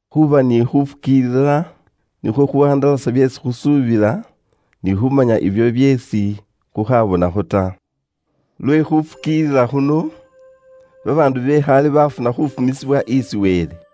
Khuuba ni khuufukiilila nikhwo khuuwandalasa byeesi khusuubila, ni khuumanya ibyo byeesi khukhabonakho ta. Lwe khuufukiilila khuno, babaandu be khaale baafuna khuufumisibwa isi Wele.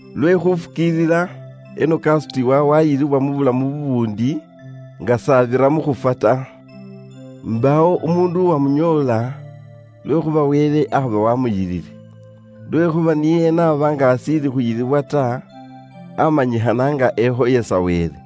Lwe khuufukiilila, Enoka aasutiwa waayilibwa mu bulamu bubuundi nga s'abira mu khufwa ta. Mbaawo umuundu uwamunyoola lwekhuuba Wele aaba waamuyilile. Lwekhuuba niye n'aba nga ashiili khuyiliwa ta, aamanyikhana nga ekhoyesa Wele.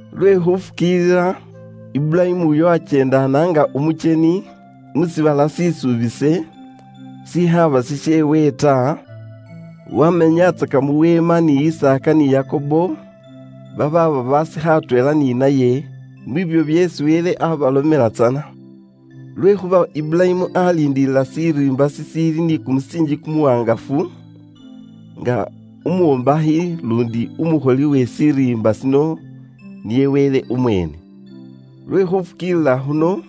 Lwe khufukiilila, Iburayimu uyo akyeendaana nga umukyeni mu shiibala shisuubise shikhaaba shisheewe ta, wamenyatsaka mu weema ni Isaaka ni Yakobo, babaaba basikha atweela ni naye mwiibyo byeesi Wele abalomela tsana. Lwekhuuba Iburayimu aliindilila shiriimba shishiili ni kumusiinji kumuwaangafu, nga umwombakhi luundi umukholi we shiriimba shino niye Wele umweene. Lwe khufukiilila khuno,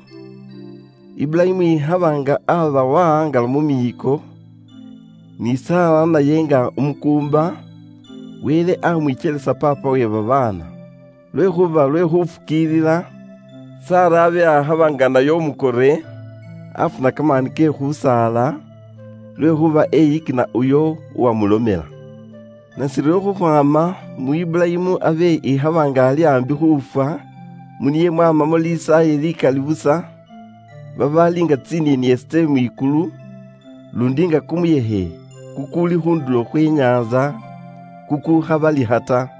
Iburayimu ikhaba nga abe wahangala mu miiko, ni Sara naye nga umukuumba, Wele amwikyelisa paapa we babaana. Lwekhuuba lwe khufukiilila, Sara abe akhaba nga naye umukore, afuna kamaani ke khusaala, lwekhuuba eyikina uyo uwamulomela. Nashiryo khukhwaama mu Iburayimu abe ikhaba nga ali aambi khuufwa, mu niye mwamamo lisaaye likali busa babaali nga tsinieniesi tse mwikulu, luundi nga kumuyekhe kukuuli khu ndulo khwe nyaantsa kukukhabalikha ta.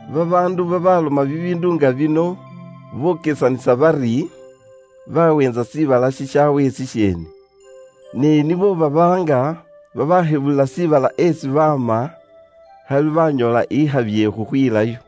Babaandu babaloma bibiindu nga bino bokesanisa bari, baweentsa shiibala shishaawe shisheene. Ne nibo baba nga babashebulila shiibala esi baama, khali banyoola ikhabi ye khukhwilayo.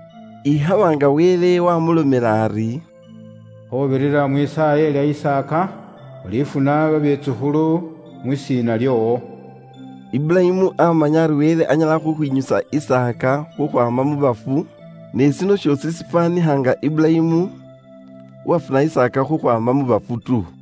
Ikhaba nga abe Wele waamulomela ari, “Khuubirira mwisaaye lya Isaaka, ulifuna babetsukhulu mwisiina lyoowo.” Iburayimu aamanya ari Wele anyala khukhwinyusa Isaaka khukhwaama mu bafu, ne shino shoosi shifwaanikha nga Iburayimu uwafuna Isaaka khukhwaama mu bafu tu.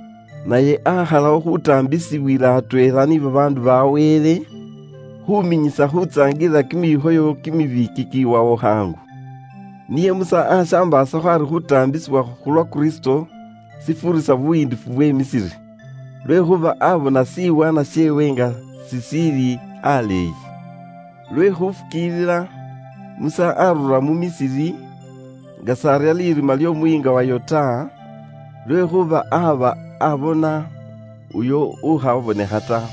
Naye aakhalawo khuutaambisibwila atweela ni babaandu ba Wele, khuuminyisa khuusaangalila kimikhoyo kye bubwoonaki, kikiwawo khaangu. Niye Musa aashambaasakho ari khuutaambisibwa khu lwa Kristo shifuurisa buyiindifu bwe Misiri. Lwekhuuba aabona shiwaanwa sheewe nga shishiili aleeyi. Lwe khuufukiilila Musa aarura mu Misiri, nga s'arya lirima ly'omuyiinga wayo ta, lwekhuuba aaba abona uyo ukhabonekha ta.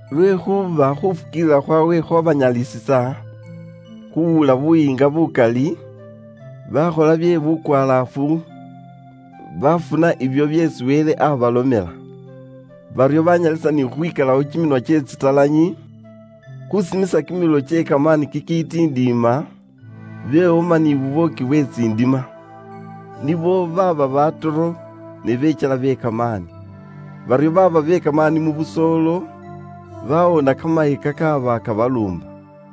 Lwekhuuba khuufukiilila khwaabwe khwabanyalisisa khuuwula buyiinga bukali, baakhola bye bukwalaafu baafuna ibyo byeesi Wele aabalomela. Baryo baanyalisa ni khukhwikalawo kiminwa kye tsitalanyi, khuusimisa kimililo kye kamaani kikiitindiima, bewoma ni bubwooki bwe tsindima. Nibo baaba batoro, ne bekyela be kamaani. Baryo baaba be kamaani mu busoolo, bawoona kamaye kakaaba kabaluumba.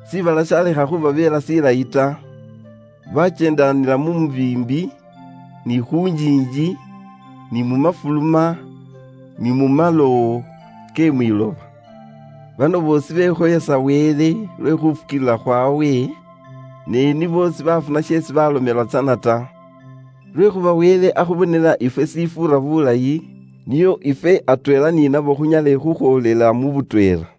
Shiibala shalekha khubabeela shilayi ta. Bakyeendanila mu mibiimbi, ni khu njiinji, ni mu mafuluma, ni mu malowo ke mwiloba. Bano boosi bekhoyesa Wele lwe khuufukiilila khwawe, ne nibo sibaafuna sheesi balomelwa tsana ta. Lwekhuuba Wele akhubonela ifwe shishifuura bulayi, nio ifwe atweela ni nabo khunyale khukhwoolela mu butweela.